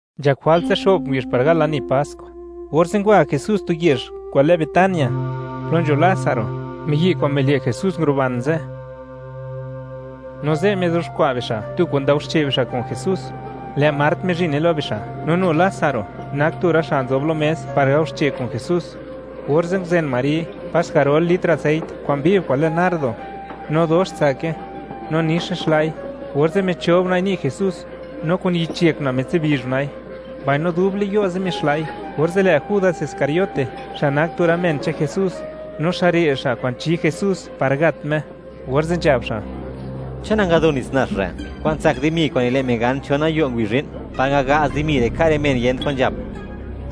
Nzhak jwalt zixo'p ngubizh par gal lani Pask, orze' ngwa Jesús tu yezh kwa'n lë Betania, plo nzho Lásaro, miyi' kwa'n mile' Jesús nguruban ze'. No ze' mizuxkwa' bixa' tu kwa'n ndaoxche' bixa' kun Jesús; lë' Mart mizhine lo bixa', no nu Lásaro nak tu rë xa' nzob lo mes par gao xche' kun Jesús, orze' nguzen Mari pas garol litr aseit kwa'n viv kwa'n lë nardo, no dox tsake, no nix nixla'i; orze' michob una'i ni' Jesús, no kun yich yek una' mitsibizh una'i, mbaino dub le'n yo' ze' mixla'i. Orze' lë' Judas Iscariote, xa' nak tu rë men che'n Jesús, no xa' re' xa' kwa'n chi Jesús par gat Me, orze' nzhab xa': ―¿Chon nangado nits nax re' kwa'n tsak dimi kwa'n nile' men gan chon gayo' ngubizh zhi'n, par ngaga'z dimi re' ka' rë men yent kwan nzhap?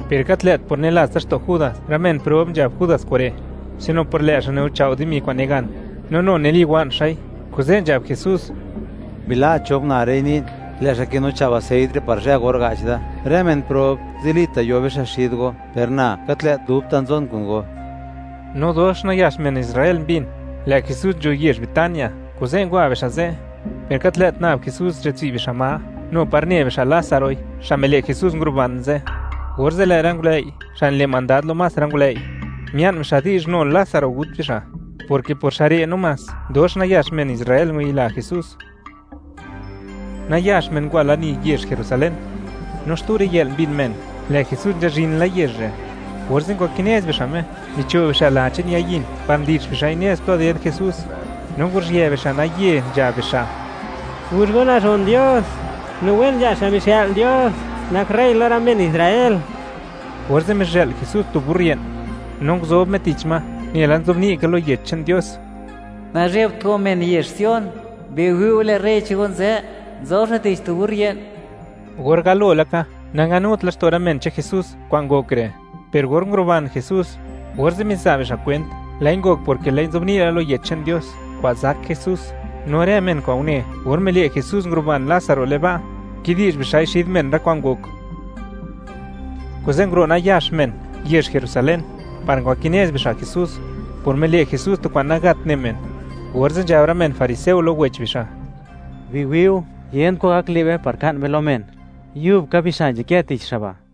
Per gat lë't por nilats laxto' Judas rë men prob nzhab Judas kure', sino por lë' xa' niguchao' dimi kwa'n nigan, no nu niliwa'n xa'i, kuze' nzhab Jesús: ―Bila' chob una' re'i ni'n, lë' xa' kinuchao' aseit re' par zhë or ga'ch da. Rë men prob, zilita' yo bixa' xid go, per na gat lë't dubta' nzon kun go. No dox nayax men Israel mbin, lë' Jesús nzho yezh Betania, kuze' ngwa bixa' ze', per gat lë't nab Jesús nzhatsi' bixa' ma, nu par ne bixa' Lázaroi, xa' mile' Jesús, nguruban ze', orze' lë' rë ngulëi' xa' nile' mandad lo más rë ngulëi', mia'n bixa' di'zh nu Lásaro gut bixa', porke por xa' re' namás, dox nayax men Israel ngwayila Jesús. Nayax men ngwa lani yezh Jerusalén, no xtu riyë'l mbin men lë' Jesús nzhazhin la yezh re', orze' ngwakinez bixa' Me, micho' bixa' la che'n ya yin par ndi'x bixa'i nez plo ded Jesús, no nguruzhië bixa' naye, nzhab bixa': ―¡Guzh go nazhon Dios! ¡No wen nzha xa' mixë'l Dios nak rey lo rë men Israel! Orze' mizhë'l Jesús tu burrit, no nguzob Me tich ma, nela nzobni' ka lo Yech che'n Dios: Nazhebt go men yezh Sion; biwi' go, lë' rey che'n go nzë, nzob xa' tich tu burrit. Or galo laka, nanganut laxto' rë men che'n Jesús kwa'n ngok re', per or nguruban Jesús, orze' miza' bixa' kwent, lë'i ngok porke lë'i nzobni' la lo Widi'zh che'n Dios kwa'n zak Jesús. No rë men kwa'n une, or mile' Jesús nguruban Lázaro le'n ba', kidi'zh bixa'i xid men rë kwa'n ngok, kuze' nguro' nayax men yezh Jerusalén par ngwakinez bixa' Jesús por mile' Jesús tu kwa'n nagat ne men, orze' nzhab rë men fariseo lo wech bixa': ―¡Biwi'u, yent kwan gak le' be par ka'n be lo men! ¡Yub ka bixa' nzhakë tich xa' ba'!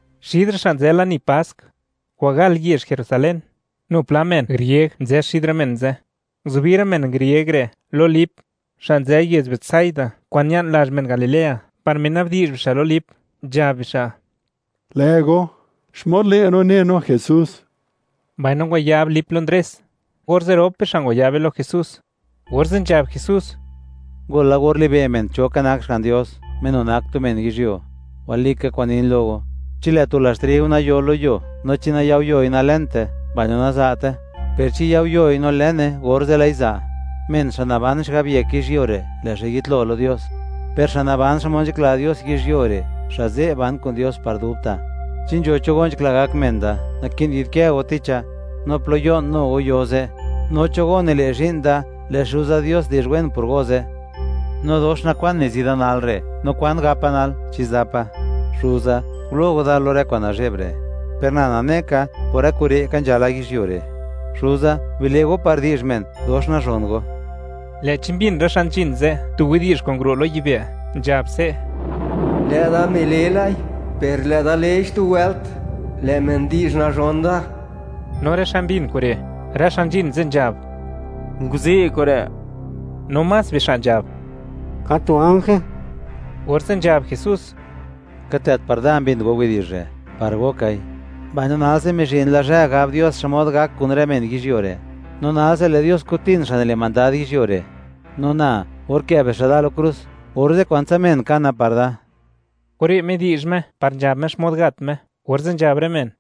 Xid rë xa' nzë lani Pask kwa'n gal yezh Jerusalén, nu pla men grieg nzë xid rë men ze'. Nguzubi rë men grieg re' lo Lip, xa' nzë yezh Betsaida kwa'n ña'n lazh men Galilea, par mina'bdi'zh bixa' lo Lip, nzhab bixa': ―Lë' go, ¿xmod le' no ne no Jesús? Mbaino ngwayab Lipe lo Ndrés, orze' rop bixa' ngwayabe lo Jesús, orze' nzhab Jesús: ―Ngol la or libe' men cho ka nak Xga'n Dios, Me nu nak tu men yizhyuo. Walika kwa'n nin lo go, chi lë' tu lazh triu nayo lo yuo no chi nayao' yoi, nalënte, mbaino naza'te; per chi yao' yoi no lëne, orze' lë'i za'. Men xa' naban xigab yek yizhyuo re', lë' xa' yitlo lo Dios; per xa' naban xmod nzhakla Dios yizhyuo re', xa' ze' ban kun Dios par dubta'. Chi nzho cho go nzhakla gak men da, naki'n yi'dkë go ticha; no plo yo'n, nu go yo ze'; no cho go nile' zhi'n da, lë' Xuza Dios di'zh wen por go ze'. ’No dox nakwan nizi da nal re'; ¿no kwan gapa nal? ¿Chi zapa?: “Xuza, gulo' Go da lo rë kwa'n nazhe'b re'.” Per na nane ka, por rë kure' ka nzhala yizhyuo re'. Xuza, bile' go par di'zh men, dox nazhon go. Lë'chi mbin rë xa' nzhin ze' tu widi'zh kwa'n nguro' lo yibë', nzhab se': ―Lë'da mile lai, per lë'da lei xtu wëlt, lë' men di'zh nazhon da. No rë xa' mbin kure', rë xa' nzhin ze', nzhab: “Nguzi' kure'”, no más bixa' nzhab: “Ka tu ganje.” Orze' nzhab Jesús: ―Gat lë't par da mbin go widi'zh re'; par go kai, mbaino nalse mizhin la zhë, gab Dios xmod gak kun rë men yizhyuo re'; no nalse lë' Dios kutin xa' nile' mandad yizhyuo re'. No na, or kë' bixa' da lo krus, orze' kwantsa men kana par da. Kure' midi'zh Me par nzhab Me xmod gat Me, orze' nzhab rë men: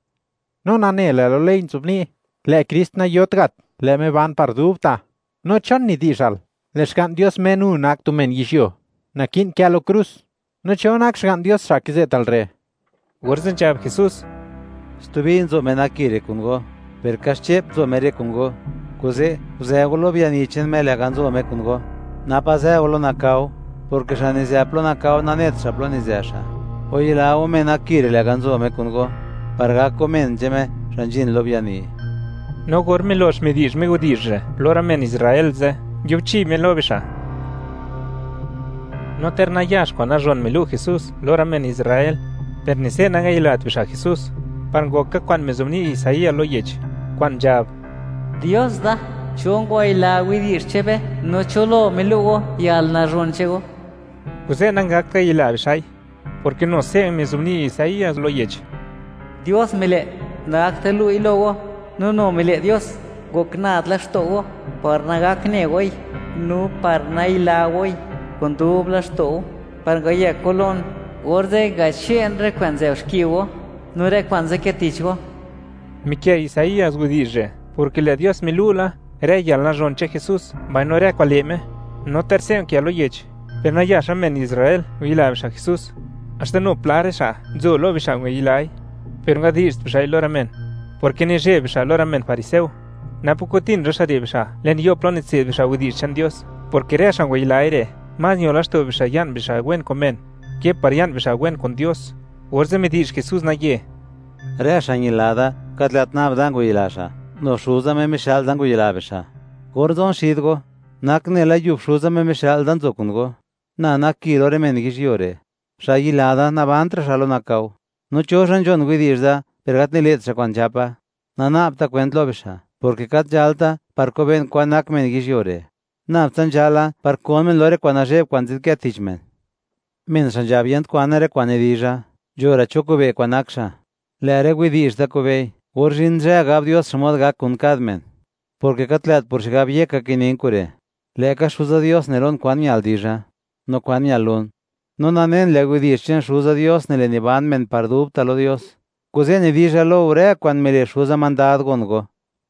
―No nane, lë' lo ley nzobni': “Lë' Krist nayot gat, lë' Me ban par dubta'.” No, ¿chon nidi'zhal, lë' Xga'n Dios Me nu nak tu men yizhyuo, naki'n kë lo krus? ¿No cho nak Xga'n Dios xa' kize'tal re'? Orze' nzhab Jesús: ―Stubi nzo Me nak Ki re' kun go, per kaxche'p nzo Me re' kun go. Kuze' guzë go lo biani che'n Me lë'ga nzo Me kun go; napa zë go lo nakao, porke xa' nizë lo nakao, nanet xa' plo nizë xa'. Wayila go Me nak Ki re' lë'ga' nzo Me kun go, par gak go men che'n Me, xa' nzhin lo biani. No or milox midi'zh Me widi'zh re' lo rë men Israel ze', nguibchi Me lo bixa'. No ter nayax kwa'n nazhon milu' Jesús lo rë men Israel, per ni se' nangayilat bixa' Jesús, par ngok ka kwa'n mizobni' Isaías lo yech, kwa'n nzhab: Dios da, ¿cho ngwayila widi'zh che'n be, no cho lo milu' go yalnazhon che'n go? Kuze' nangakt ngayila bixa'i, porke nu se' mizobni' Isaías lo yech: Dios mile' nagakt lu'i lo go, no nu mile' Dios, ngok nad laxto' go; par nagak ne goi, no par nayila goi kun dub laxto' go; par ngayëk go lon, orze' ngache'n rë kwa'n nzë'b xki go, no rë kwa'n nzadkë tich go. Mikë' Isaías widi'zh re' porke lë' Dios milu' la rë yalnazhon che'n Jesús, mbaino rë kwa'n le' Me. No ter se' unkë lo yech, per nayax men Israel ngwayila bixa' Jesús, haxta nu pla rë xa' nzo lo bixa' ngwayilai, per nangadi'zht bixa'i lo rë men porke nizheb bixa' lo rë men fariseo, napa' kutin rë xa' re' bixa' le'n yo' plo nitse'd bixa' widi'zh che'n Dios, porke rë xa' ngwayilai re', más ño laxto' bixa' ya'n bixa' wen kun men, ke par ya'n bixa' wen kun Dios. Orze' midi'zh Jesús naye: ―Rë xa' ñila da, gat lë't nab da ngwayila xa'; nu Xuza Me mixë'l da, ngwayila bixa'. Or nzon xid go, nak nela yub Xuza, Me mixë'l da, nzo kun go. Na nak Ki lo rë men yizhyuo re'; xa' yayila da, nakizëtra' xa' lo nakao, no cho xa' nzhon widi'zh da, per gat nile't xa' kwa'n nzhapa, nana'bta kwent lo bixa', porke gat nzhalta par kobe'n kwan nak men yizhyuo re'; nab tsa nzhala par kon men lo rë kwa'n nazhe'b kwa'n nzadkë tich men. Men xa' nzhab yent kwane rë kwa'n nidizha, nzho ra' cho kobe' (wi') kwan nak xa', lë' rë widi'zh da kobe'i, or zhin zhë gab Dios xmod gak kun kad men. Porke gat lë't por xigab yeka kinin kure', lë'ka Xuza Dios ne lon kwan ñal dizha, no kwan ñal lun. No nanen, lë' widi'zh che'n Xuza Dios, nile' niban men par dubta' lo Dios. Kuze' nidizha lo go, rë kwa'n mile' Xuza mandad gon go.